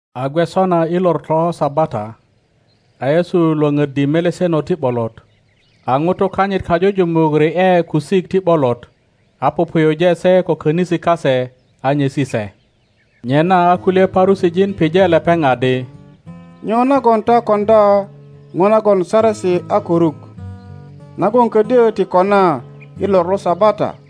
A gwe sona i lor lo Sabata, a yesu lwöŋöddi meleseno ti ’bolot, a ŋutu kanyit kajujumuk ri ’ye kusik ti ’bolot, a pupuyuje se ko könisi kase, a nyesi se. Nyena a kulye Parusijin pije lepeŋ adi, Nyo nagon ta koŋdya ŋo nagon saresi a ko ruk, nagon ködyö ti kona i lor lo Sabata?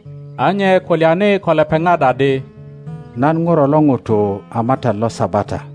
A nye kulyani ko lepeŋat adi, Nan ŋuro lo ŋuto a matat lo Sabata.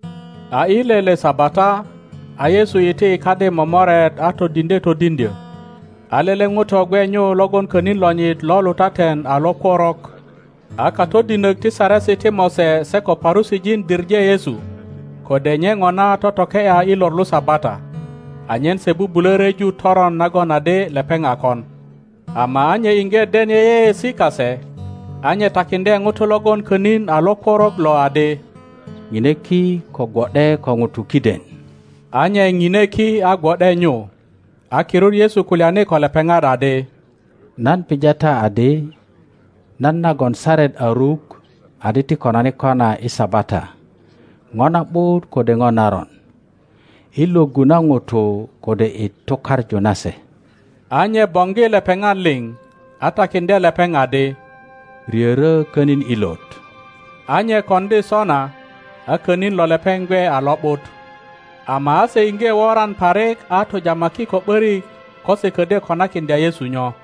A i lele Sabata, a Yesu iti i kadi momoret a todiŋdye todiŋdyö, a lele ŋuto gwe nyu logon könin lonyit lo lutaten a lokworok. A katodinök ti Saresi ti Mose se ko Parusijin diŋe Yesu, kode nye ŋona totoke ’ya i lor lo Sabata, anyen se bubulö ryeju toron nagon adi lepeŋ a kon. Ama a nye iŋge den yeyeesi kase, a nye takiŋdye ŋuto logon könin a lokworok lo adi, Ŋine ki ko gwo ’de ko ŋutu kiden. A nye ŋine ki a gwo ’de nyu. A kirut Yesu kulyani ko lepeŋat adi, Nan pija ta adi, Nan nagon saret a ruk adi ti konani kona i Sabata, ŋo na ’but, kode ŋo naron? I lwöggu na ŋutu kode i tukaŋu na se? A nye boŋgi lepeŋat liŋ, a takiŋdye lepeŋ adi, Rioro könin ilot, a nye koŋdi sona, a könin lo lepeŋ gwe a lo ’but. Ama a se iŋge woran parik a tujamaki ko ’borik ko se ködyö konakiŋdya Yesu nyo.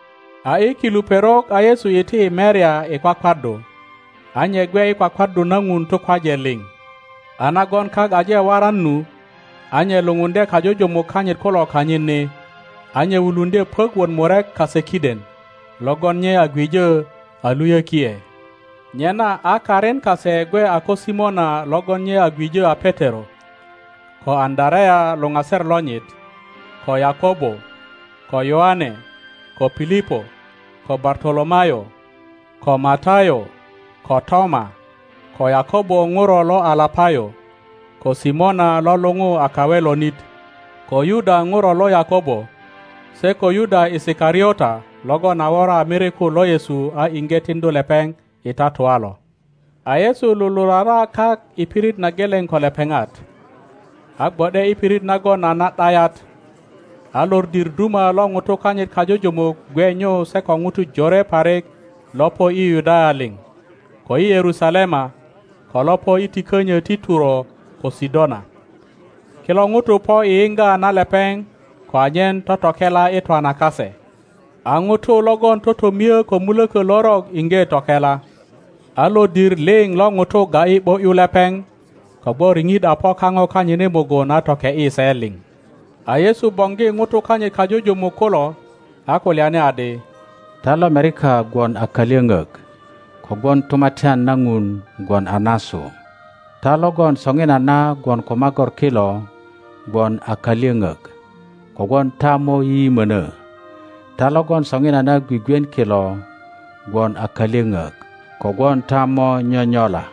A i kilu perok a Yesu iti i merya i kwakwaddu; a nye gwe i kwakwaddu na Ŋun tukwaje liŋ. a nagon kak aje waran nu, a nye lupundye kajujumuk kanyit kulo kanyit ni, a nye wuluŋdye puök wot murek kase kiden, logon nye a gwijö a luyökie. Nyena a karin kase gwe a ko Simona logon nye a gwijö a Petero; ko Aŋöarea luŋaser lonyit, ko Yakobo, ko Yoane, ko Pilipo, ko Bartolomayo, ko Matayo, ko Toma, ko Yakobo ŋuro lo Alapayo, ko Simona lo luŋu a Kawelonit, ko Yuda ŋuro lo Yakobo, se ko Yuda Isikariota logon a wora a miriku lo Yesu a iŋge tiŋdu lepeŋ i tatua lo. A Yesu lulurara kak i pirit na geleŋ ko lepeŋat, a gwo ’de i pirit nagon a na ’dayat, a lodir duma lo ŋutu kanyit kajujumuk gwe nyu se ko ŋutu jore parik lo po i Yudaya liŋ, ko i Yerusalema, ko lo po i tikönyö ti Turo ko Sidona. Kilo ŋutu po i yiŋga na lepeŋ ko anyen totokela i twana kase, a ŋutu logon totomiö ko mulökö lorok iŋge tokela. A lodir liŋ lo ŋutu ga ’yi ’bo ’yu lepeŋ, kogwon riŋit a po kaŋo kanyit i mugun a toke ’yi se liŋ. A Yesu boŋgi ŋutu kanyit kajujumuk kulo, a kulyani adi, Ta lomerika gwon a kalyöŋok, kogwon tumatyan na Ŋuni gwon a nasu. Ta logon soŋinana gwon ko magor kilo gwon a kalyöŋök, kogwon ta mo yiyimönö. Ta logon soŋinana gwigwien kilo gwon a kalyöŋök, kogwon ta mo nyonyola.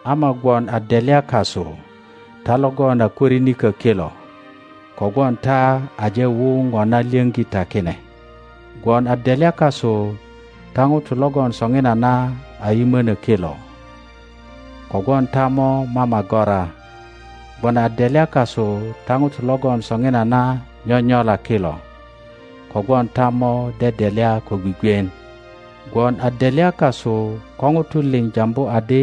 Ama gwon a delya kasu ta logon a kwörinikö kilo, kogwon ta aje wu ŋo na lyöŋgi ta kine. Gwon a delya kasu ta ŋutu logon soŋinana a yimönö kilo, kogwon ta mo mamagora. Gwon a delya kasu ta ŋutu logon soŋinana nyonyola kilo, kogwon ta mo dedelya ko gwigwien. Gwon a delya kasu ko ŋutu liŋ jambu adi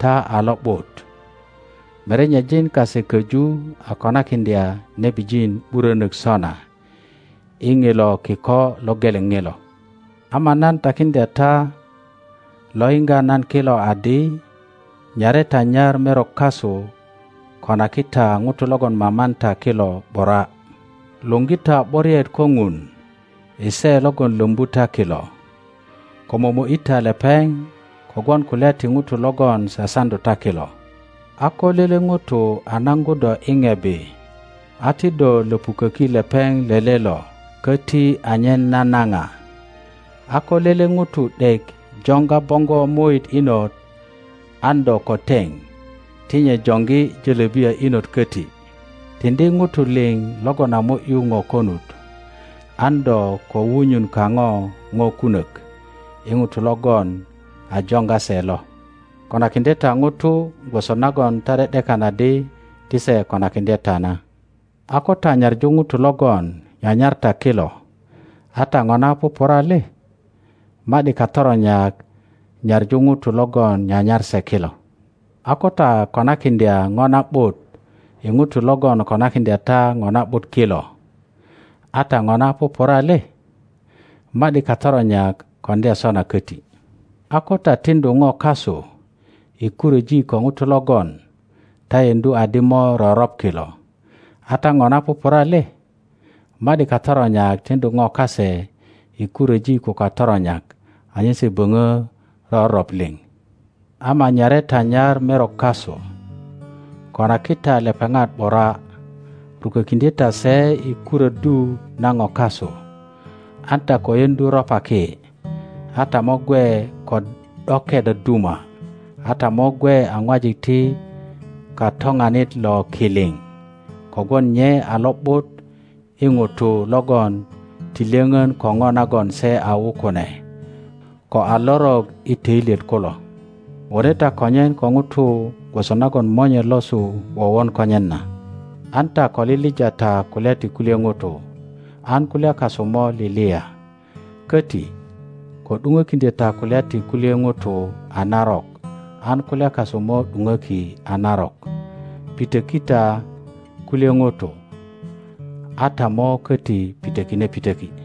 ta a lo ’but. Merenyejin kase köju a konakiŋdya nebijin ’burönök sona i ŋilo kiko lo geleŋ ŋilo. Ama nan takiŋdya ta lo yiŋga nan kilo adi, Nyare ta nyar merok kasu, konaki ta ŋutu logon maman ta kilo ’bura, luŋgi ta ’boriet ko Ŋun i se logon lömbu ta kilo, ko momo ’yi ta lepeŋ kogwon kulya ti ŋutu logon sasaŋdu ta kilo. a ko lele ŋuto a naŋgu do i ŋebi, a ti do lopuköki lepeŋ lele lo köti anyen nanaŋa. A ko lele ŋuto ’dek joŋga boŋgo muit inot an do ko teŋ, ti nye joŋgi jölöbiya inot köti. Tiŋdi ŋutu liŋ logon a mo ’yu ŋo konut; an do ko wunyun kaŋo ŋo kunök i ŋuto logon a joŋga se lo. Konakiŋdye ta ŋutu gwoso nagon ta ’de ’dekan adi ti se konakiŋdye ta na. A ko ta nyaŋu ŋutu logon nyanyar ta kilo, a ta ŋona pupura le? Ma ’di katoronyak nyaŋu ŋutu logon nyanyar se kilo. A ko ta konakiŋdya ŋo na ’but i ŋutu logon konakiŋdya ta ŋo na ’but kilo, a ta ŋona pupura le? Ma ’di katoronyak koŋdya sona koti. A ko ta tiŋdu ŋo kasu i kuröji ko ŋutu logon ta yeŋdu adi mo roröŋ kilo, a ta ŋona pupura le? Ma ’di katoronyak tiŋdu ŋo kase i kuroji ko katoronyak anyen se boŋö roröŋ liŋ. Ama nyare ta nyar merok kasu, konaki ta lepeŋat ’bura. Rukökiŋdye ta se i kuröddu na ŋo kasu, an ta ko yeŋdu ropaki; a ta mo gwe ko ’doket a duma, a ta mo gwe a ŋwajik ti Katoŋanit lo ki liŋ; kogwon nye a lo ’but i ŋutu logon ti lyotion ko ŋo nagon se a wu kune ko a lorok i toilyet kulo. Wone ta konyen ko nutu gwoso nagon Monye losu wowon konyen na. An ta ko lilija ta kulya ti kulye nutu, an kulya kasu mo lilia. Koti ko ’duŋökiŋdyö ta kulya ti kulye ŋutu a narok an kulya kasu mo ’duŋöki a narok. Pitöki ta kulye ŋutu, a ta mo koti pitokine pitöki.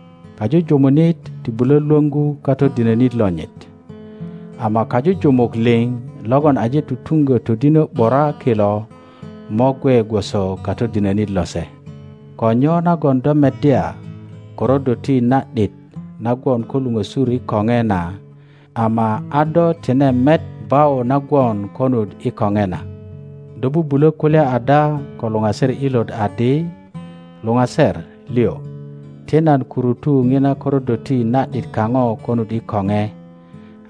Kajujumunit ti bulo lwöŋgu katodinonit lonyit, ama kajujumuk liŋ logon aje tutuŋgo todino ’bura kilo mo gwe gwoso katodinonit lose. Ko nyo nagon do meddya korodoti na ’dit na gwon ko luŋosur i koŋe na ama a do tine met bau na gwon konut i koŋe na? Do bubulo kulya ada ko luŋaser ilot adi, Luŋaser liŋ, ti nan kurutu ŋina korodoti na ’dit kaŋo konut i koŋe,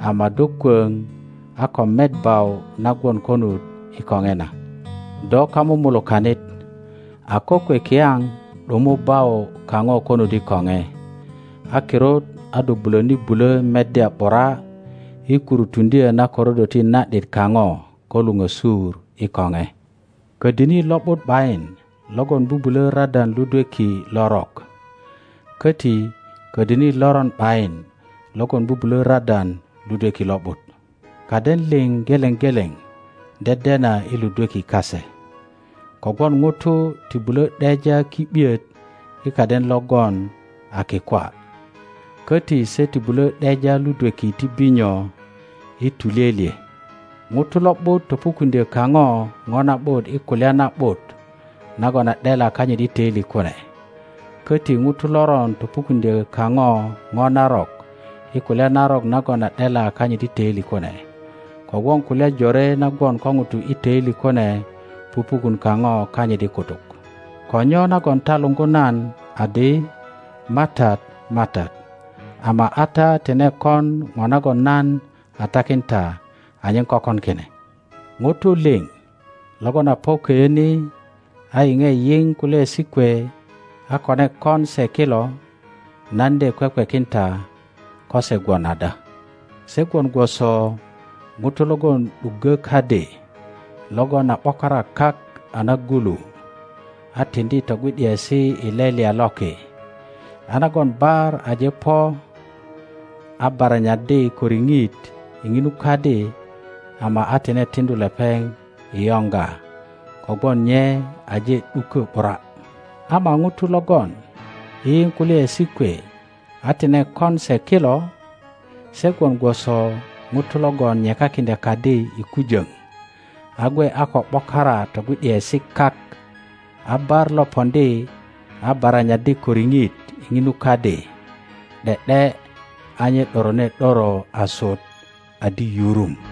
ama do kwoŋ a ko met bau na gwon konut i koŋe na? Do kamumulukanit, a kokwe kiyaŋ ’dumu bau kaŋo konut i koŋe, a kirut a do buloni bulo meddya ’bura i kurutuŋdyo na korodoti na ’dit kaŋo ko luŋösur i koŋe. Ködini lo ’but ’bayin logon bubulo radan ludweki lorok; koti ködini loron ’bayin logon bubulo radan ludweki lo ’but. Kaden liŋ geleŋ geleŋ dedena i ludweki kase; kogwon ŋutu ti bulo ’deja ki ’biet i kaden logon a kikwa, koti se ti bulo ’deja ludweki ti binyo i tulyelye. ŋuto lo ’but topukuŋdyo kaŋo ŋo na ’but i kulya na ’but nagon a ’dela kanyit i toili kune; koti ŋuto loron topukuŋdyo kaŋo ŋo narok i kulya narok nagon a ’dela kanyit i toili kune. Kogwon kulya jore na gwon ko ŋuto i toili kune pupukun kaŋo kanyit i kutuk. Ko nyo nagon ta luŋgu nan adi, MATAT, MATAT, ama a ta tine kon ŋo nagon nan a takin ta anyen kökon kine? Ŋutu liŋ logon a po koyo ni a yiŋe yiŋ kulyaesi kwe, a kone kon se kilo, nan de kwekwekin ta ko se gwon ada. Se gwon gwoso ŋuto logon ’duggo kadi, logon a ’bokara kak a nagulu, a tiŋdi togwi ’diesi i lelya loki. A nagon bar aje po a baranyaddi ko riŋit i ŋinu kadi, ama a tine tiŋdu lepeŋ i yoŋga, kogwon nye aje ’duko ’bura. Ama ŋutu logon yiyiŋ kulyaesi kwe, a tine kon se kilo, se gwon gwoso ŋuto logon nyekakiŋdya kadi i kujöŋ a gwe a ko ’bokara togwi ’diesi kak. A bar lo poŋdi, a baranyaddi ko riŋit i ŋinu kadi, ’de ’de a nye ’dorone ’doro asut adi yurum.